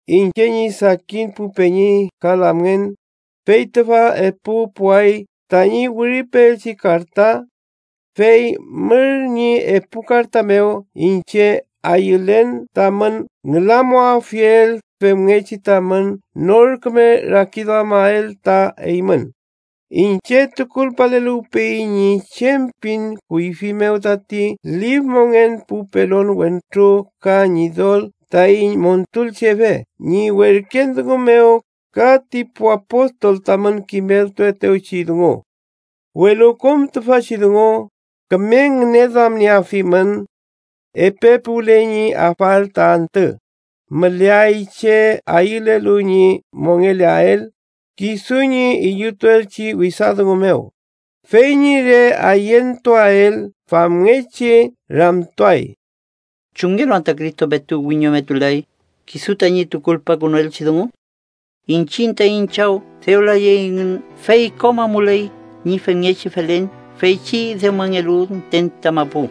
Iñche ñi sakin pu peñi ka lamngen, fey tüfa epu puway tañi wiripeelchi karta. Fey mür ñi epu karta mew iñche ayülen tamün ngülamuwafiel femngechi tamün nor küme rakiduamael ta eymün. Iñche tukulpaleluwpeyiñ ñi chem pin kuyfi mew tati lif mongen pu pelon wentru ka Ñidol taiñ Montulchefe ñi werken dungu mew, ka ti pu apostol tamün kimeltuetewchi dungu. Welu kom tüfachi dungu, küme ngüneduamnieafimün. Epe puwle ñi afael ta antü, müleay che ayülelu ñi mongeleael kisu ñi illutuelchi wesa dungu mew. Fey ñi re ayentuael famngechi ramtuay: “¿chumngelu anta Cristo petu wiñometulay kisu tañi tukulpakünuelchi dungu? Iñchiñ taiñ chaw dew layey engün, fey kom amuley ñi femngechi felen feychi dewmangelu müten ta mapu.”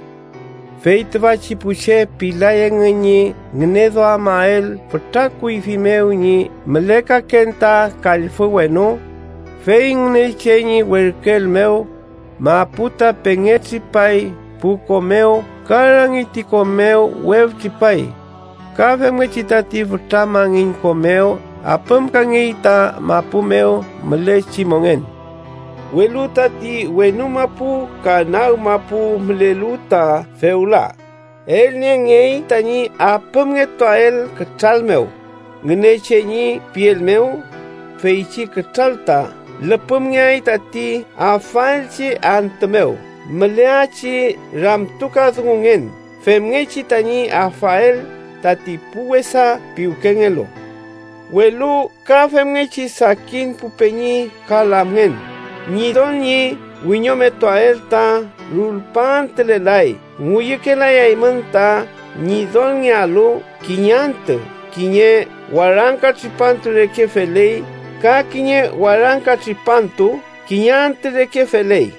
Fey tüfachi pu che pilay engün ñi ngüneduamael fütra kuyfi mew ñi mülekaken ta kallfü wenu, fey Ngünechen ñi werküel mew, mapu ta pengetripay pu ko mew ka rangi ti ko mew weftripay. Ka femngechi tati fütra mangin ko mew apümkangey ta mapu mew mülechi mongen. Welu tati wenu mapu ka nag mapu mülelu ta fewla, elniengey tañi apümngetuael kütral mew Ngünechen ñi piel mew. Feychi kütral ta lüpümaeyew tati afaelchi antü mew müleachi ramtukadungungen femngechi tañi afael tati pu wesa piwkengelu. Welu ka femngechi sakin pu peñi ka lamngen, Ñidol ñi wiñometuael ta rulpaantülelay ngüyükelayaymün ta Ñidolngealu kiñe antü kiñe warangka tripantu reke feley, ka kiñe warangka tripantu kiñe antü reke feley.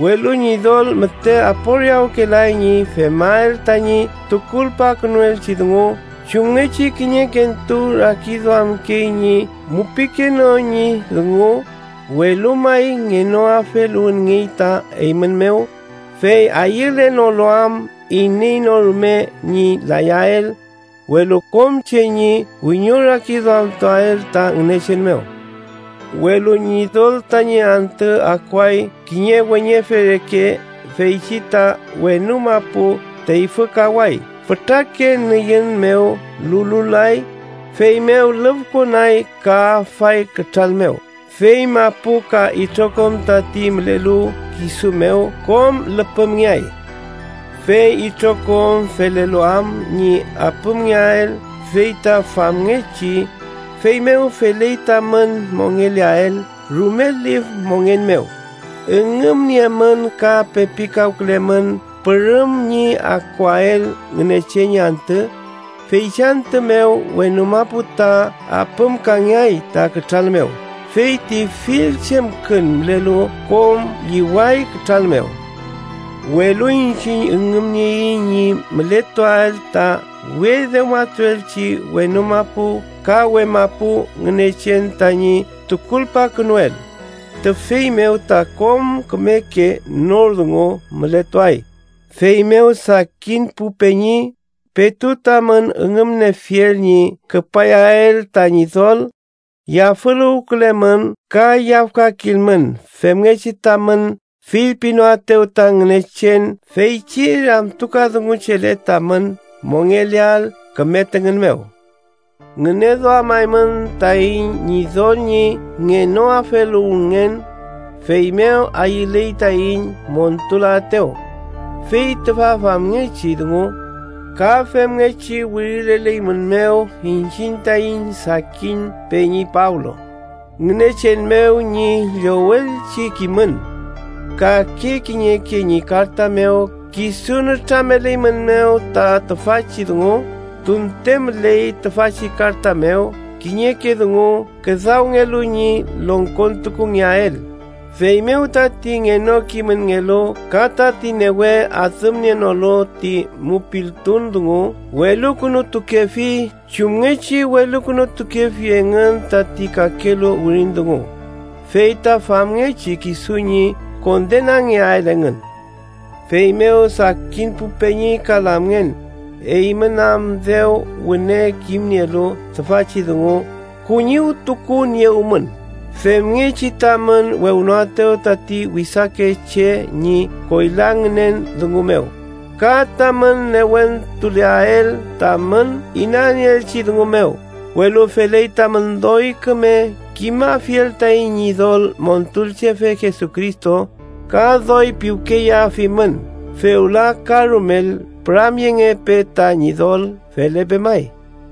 Welu Ñidol müte aporiawkelay ñi femael tañi tukulpakünuelchi dungu chumngechi kiñekentu rakiduamkey ñi mupikenon ñi dungu, welu may ngenoafeluwünngey ta eymün mew, fey ayülenolu am iney no rume ñi layael, welu kom che ñi wiñorakiduamtuael ta Ngünechen mew. Welu Ñidol tañi antü akuay kiñe weñefe reke. Feychi ta wenu mapu teyfükaway fütrake nüyün mew lululay, feymew lüfkonay ka afay kütral mew, fey mapu ka itrokom tati mülelu kisu mew kom lüpümngeay. Fey itrokom felelu am ñi apümngeael fey ta famngechi. ¡Feymew feley tamün mongeleael rume lif mongen mew! Üngümniemün ka pepikawkülemün pürüm ñi akuael Ngünechen ñi antü. Feychi antü mew wenu mapu ta apümkangeay ta kütral mew, fey ti fill chemkün mülelu kom lliway kütral mew. Welu iñchiñ üngümnieiñ ñi mületuael ta we dewmatuelchi wenu mapu ka we mapu Ngünechen tañi tukulpakünuel, tüfey mew ta kom kümeke nor dungu mületuay. Feymew sakin pu peñi, petu tamün üngümniefiel ñi küpayael ta Ñidol, yafüluwkülemün ka yafkakilmün femngechi tamün fillpinoaetew ta Ngünechen feychi ramtukadunguchele tamün mongeleael küme tüngün mew. Ngüneduamaymün taiñ Ñidol ñi ngenoafeluwünngen, feymew ayüley taiñ montulaetew. Fey tüfa famngechi dungu, ka femngechi wirileleymünmew iñchiñ taiñ sakin peñi Pablo, Ngünechen mew ñi llowelchi kimün. Kake kiñeke ñi karta mew kisu nütrameleymünmew ta tüfachi dungu, tunte müley tüfachi karta mew kiñeke dungu küdawngelu ñi longkontukungeael, feymew tati ngenokimünngelu ka tati newe adümnienolu ti mupiltun dungu welukünutukefi, chumngechi welukünutukefi engün tati kakelu wirin dungu, fey ta famngechi kisu ñi kondenangeael engün. Feymew sakin pu peñi ka lamngen, eymün am dew wüne kimnielu tüfachi dungu, kuñiwtukuniewmün, femngechi tamün wewnoaetew tati wesake che ñi koyla ngünen dungu mew ka tamün newentuleael tamün inanieelchi dungu mew. Welu feley tamün doy küme kimafiel taiñ Ñidol Montulchefe Jesucristo ka doy piwkeyeafimün. ¡Fewla ka rumel püramyengepe ta Ñidol! Felepe may.